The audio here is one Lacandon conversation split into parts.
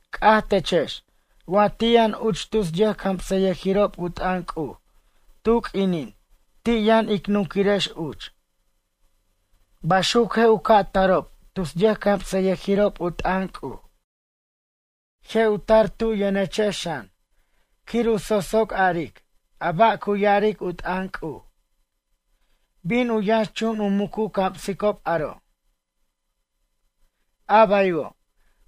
C'aj techex wa ti' yʌn uch tus yʌjcamsʌyʌjirob u t'ʌn C'uj tu q'uinin ti' yʌn ic nunquirex uch. Baxuc je' u ca' tarob tus yʌjcamsʌyʌjirob u t'ʌn C'uj. Je' u tar tu yʌnechex xan quir u sosoc aric a ba' cu ya'aric u t'ʌn C'uj. Bin u yʌnxchun u muc u camsicob aro'. A baywo',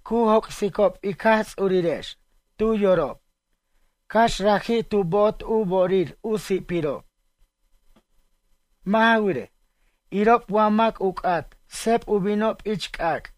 cu joc'sicob ic Jaj Ts'urirex tu yorob cax raji' tu bo'ot u bo'orir u si'pirob. Mʌ' ja wirej, irob wa mac u c'at sep u binob ich c'ac'.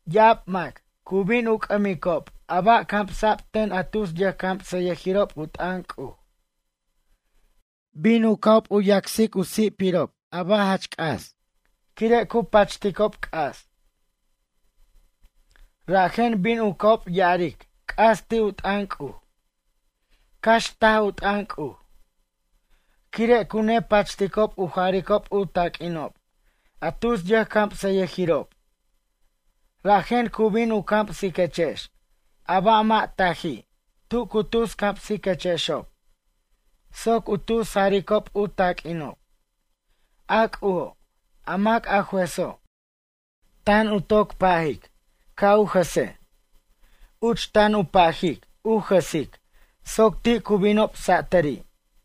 Ya'ab mac cu bin u c'ʌmicob a ba' camsa'b ten a tus yʌjcamsʌyʌjirob u t'ʌn C'uj. Bin u ca'ob yacs u si'pirob a ba' jach c'as, quire' cu pachticob c'as. Rajen bin u ca'ob ya'aric c'as ti' u t'ʌn C'uj, cax taj u t'ʌn C'uj. Quire' cu nepachticob u jaricob u taq'uinob a tus yʌjcamsayʌjirob, rajen cu bin u camsiquechex a ba' mʌ' taji' tu cu tus camsiquechexob soc u tus jaricob u taq'uinob. A C'ujo', a mac a jueso', tan u toc pajic ca' u jʌse, uch tan u pajic u jʌsic soc ti' cu binob satʌri'.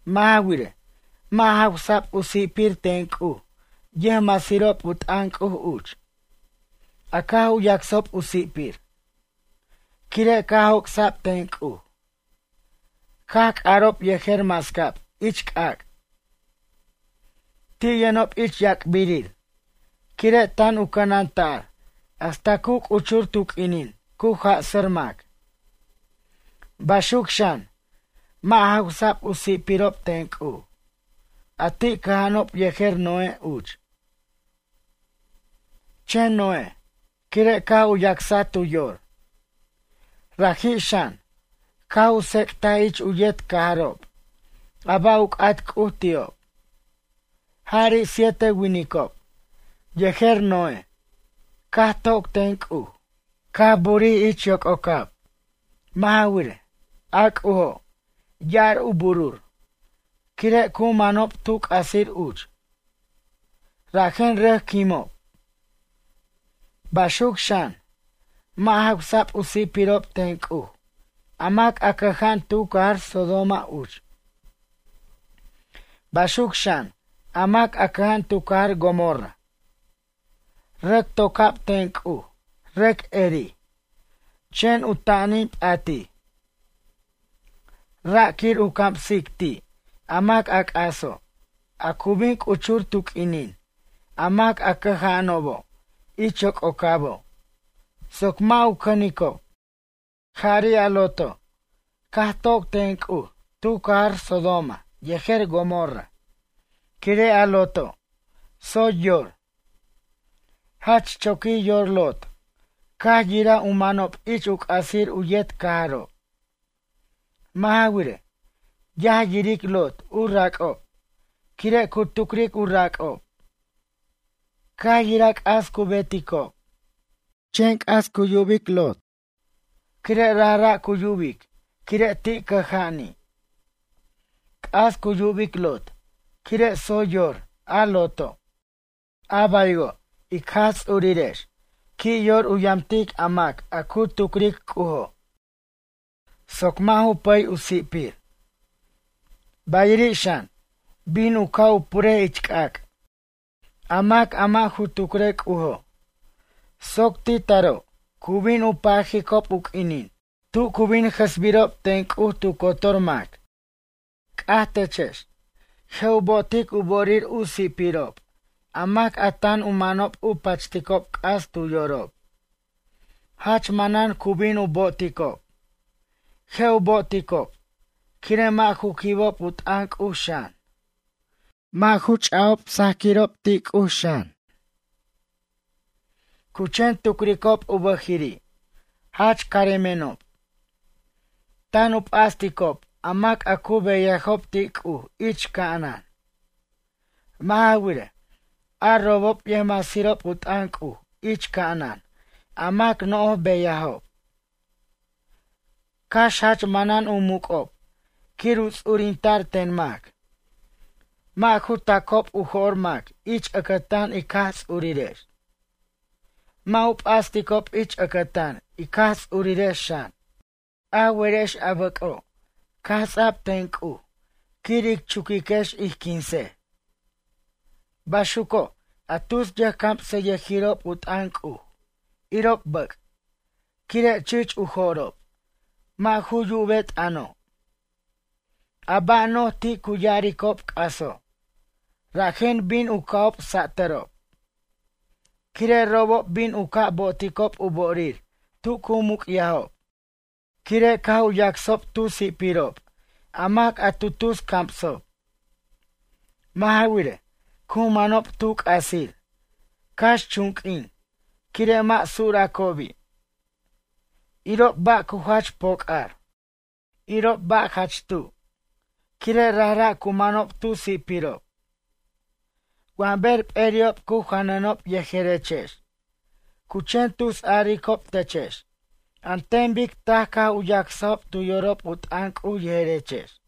Mʌ' ja wirej, mʌ' jawsa'b u si'pir ten C'uj yʌjmasirob u t'ʌn C'uj uch, a caj u yacsob u si'pir. Quire' caj joc'sa'b ten C'uj. Caj c'arob yejer mascab ich c'ac'. Ti' yʌnob ich yac'birir quire' tan u cʌnanta'r hasta cu c'uchur tu q'uinin cu jasʌr mac. Baxuc xan, mʌ' jawsa'b u si'pirob ten C'uj, a ti' cʌja'anob yejer Noé, uch. Chen Noé quire' caj u yacsa tu yor. Raji' xan, caj u tsec'taj ich u yet cajarob a ba' u c'at C'uj ti'ob. Jari' siete winicob yejer Noé caj toc ten C'uj, caj burij ich yoc'ocab. Mʌ' ja wirej, a C'ujo', ya'ar u burur, quire' cu manob tu c'asir uch, rajen rʌc quimob. Baxuc xan, mʌ' jawsa'b u si'pirob ten C'uj a mac a cʌja'an tu cajar Sodoma uch. Baxuc xan a mac a cʌja'an tu cajar Gomorra. Rʌc toca'b ten C'uj rʌc erij, chen u ta'anin p'atij. Ra' quir u camsic ti' a mac a c'aso', a cu bin c'uchur tu q'uinin a mac a cʌja'anobo' ich yoc'ocabo' soc mʌ' u cʌnicob. Jari' a Loto', caj toc ten C'uj tu cajar Sodoma yejer Gomorra, quire' a Loto', tsoy yor. Jach choquij yor Lot caj yiraj u manob ich u c'asir u yet cajarob. Mʌ' ja wirej, yaj yiric Lot u rac'ob, quire' cu tucric u rac'ob. Caj yiraj c'as cu beticob. Chen c'as cu yubic Lot, quire' rajra' cu yubic quire' ti' cʌja'ani'. C'as cu yubic Lot quire' tsoy yor a Loto'. A baywo', ic Jaj Ts'urirex qui' yor u yamtic a mac a cu tucric C'ujo' soc mʌ' ju pʌy u si'pir. Bayiri' xan bin u ca' u pure ich c'ac', a mac a mʌ' ju tucre C'ujo' soc ti' taro' cu bin u pajicob u q'uinin tu cu bin jʌsbirob ten C'uj tu cotor mac. C'aj techex. Je' u bo'otic u bo'orir u si'pirob a mac a tan u manob u pachticob c'as tu yorob. Jach manan cu bin u bo'oticob. Je' u bo'oticob, quire' mʌ' ju quibob u t'ʌn C'uj xan. Mʌ' ju ch'ajob sajquirob ti' C'uj xan. Cu chen tucricob u bʌjiri': “Jach caremenob.” Tan u p'asticob a mac a cu beyajob ti' C'uj ich ca'anan. Mʌ' ja wirej, a robob yʌjmasirob u t'ʌn C'uj ich ca'anan a mac no'j beyajob. Cax jach manan u muc'ob quir u ts'urinta'r ten mac. Mʌ' ju ta'cob u jo'r mac ich ʌcʌtan ic Jaj Ts'urirex. Mʌ' u p'asticob ich ʌcʌtan ic Jaj Ts'urirex xan. A werex a bʌc'o' caj ts'a'b ten C'uj quir ic chuquiquex ij quinsej. Baxuco', a tus yʌjcamsʌyʌjirob u t'ʌn C'uj, irob bʌc', quire' chich u jorob, mʌ' ju yube t'ʌno'. A ba' no'j ti' cu ya'aricob c'aso' rajen bin u ca'ob satʌrob. Quire' robob bin u ca' bo'oticob u bo'orir tu cu muc'yajob quire' caj u yacsob tu si'pirob a mac a tu tus camsob. Mʌ' ja wirej, cu manob tu c'asir, cax chunq'uin, quire' mʌ' suracobi'. Irob ba' cu jach poc'ar. Irob ba' jach tu', quire' rajra' cu manob tu si'pirob. Wa ber p'eri'ob cu janʌnob yejerechex, cu chen tusaricob techex an ten bic taj caj u yasajob tu yorob u t'ʌn C'uj yejerex.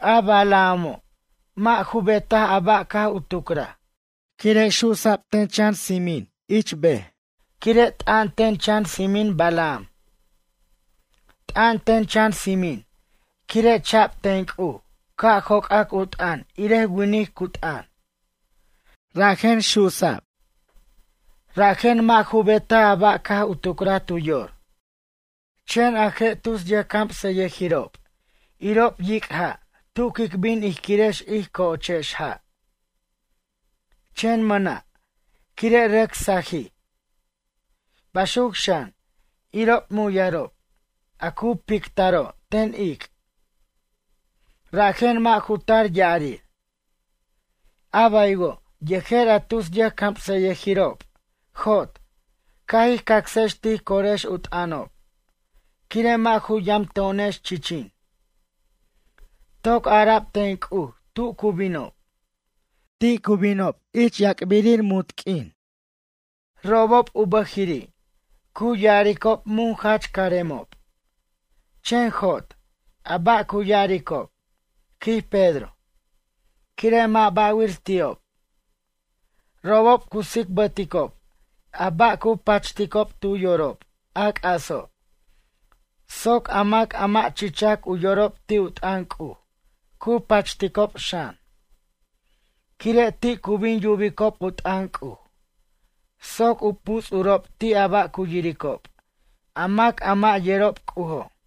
A Balaamo' mʌ' ju betaj a ba' caj u tucraj quire' su'sa'b ten chan tsimin ich ber quire' t'an ten chan tsimin Balaam. T'an ten chan tsimin quire' cha'b ten C'uj ca' joc'ac u t'ʌn irej winic cu t'ʌn. Rajen su'sa'b. Rajen mʌ' ju betaj a ba' caj tu tucraj tu yor. Chen a je' tus yʌjcamsayʌjirob irob yic' ja' tu quic bin ij quirex ij co'ochex ja', chen mʌna', quire' rʌc sajij. Baxuc xan, irob muyarob, a cu pictaro' ten ic', rajen mʌ' ju tar ya'arir. A baywo', yejer a tus yʌjcamsʌyʌjirob, jot, ca' jij cacsex tij corex u t'ʌnob, quire' mʌ' ju yamto'onex chichin. Toc ara'b ten C'uj tu cu binob. Ti' cu binob yac'birir munt q'uin. Robob u bʌjiri', cu ya'aricob mun jach caremob, chen jot a ba' cu ya'aricob, quij Pedro, quire' mʌ' ba'wir ti'ob. Robob cu tsicbʌticob a ba' cu pachticob tu yorob, a c'aso' soc a mac a mʌ' chichac u yorob ti' u t'ʌn C'uj cu pachticob xan. Quire' ti' cu bin yubicob u t'ʌn C'uj soc u puts'urob ti' a ba' cu yiricob a mac a mʌ' yerob C'ujo'.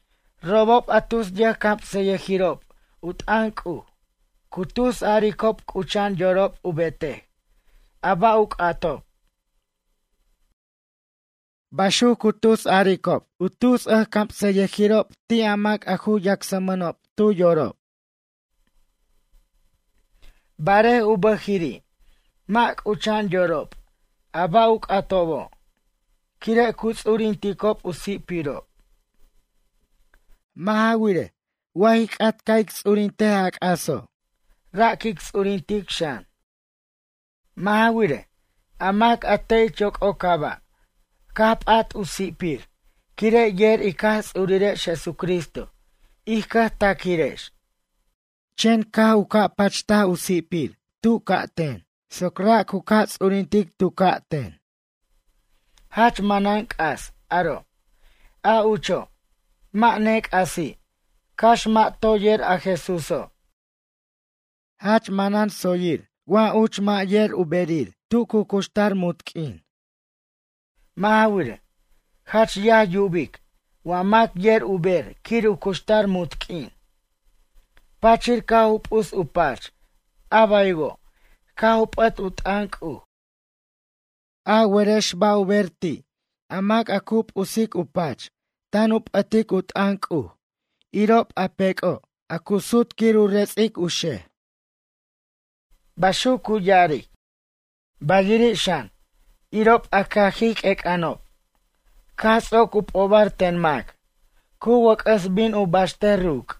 Robob a tus yʌjcamsʌyʌjirob u t'ʌn C'uj cu tus a'aricob c'ucha'an yorob u betej a ba' u c'atob. Baxuc cu tus a'aricobo' tus yʌjcamsʌyʌjirob ti' a mac a cu yacsmʌnob tu yorob. Barej u bʌjiri' mʌ' c'ucha'an yorob a ba' u c'atobo' quire' cu ts'urinticob u si'pirob. Mʌ' ja wirej, wa ij c'at ca' ic ts'urint a c'aso', ra' quic ts'urintic xan. Mʌ' ja wirej, a mac a te' ich yoc'ocaba' caj p'at u si'pir quire' yer ic Jaj Ts'urirex Jesucristo ij cʌjtaq'uirex. Chen caj u ca' pacht u si'pir tu ca'ten, soc ra' cu ca' ts'urintic tu ca'ten. Jach manan c'as aro', a ucho', mʌ' nec'asi' cax mʌ' toy yer a Jesúso'. Jach manan tsoyir wa uch mʌ' yer u berir tu cu cuxtar munt q'uin. Mʌ' ja wirej, jach yaj yubic wa mac yer u ber quir u cuxtar munt q'uin, pachir caj u p'us u pach a baywo', caj u p'ʌt u t'ʌn C'uj. A werex ba' u ber ti' a mac, a cu p'us u pach tan u p'ʌt u t'ʌn C'uj irob a pec'ob a cu sut quir u ret'sic u xej. Baxuc cu ya'aric. Bayiri' xan, irob a cajij q'uec'anob, caj ts'oc u p'obar ten mac, cu wʌc'ʌs bin u baxtej ruc'.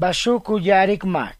Baxuc cu ya'aric mac.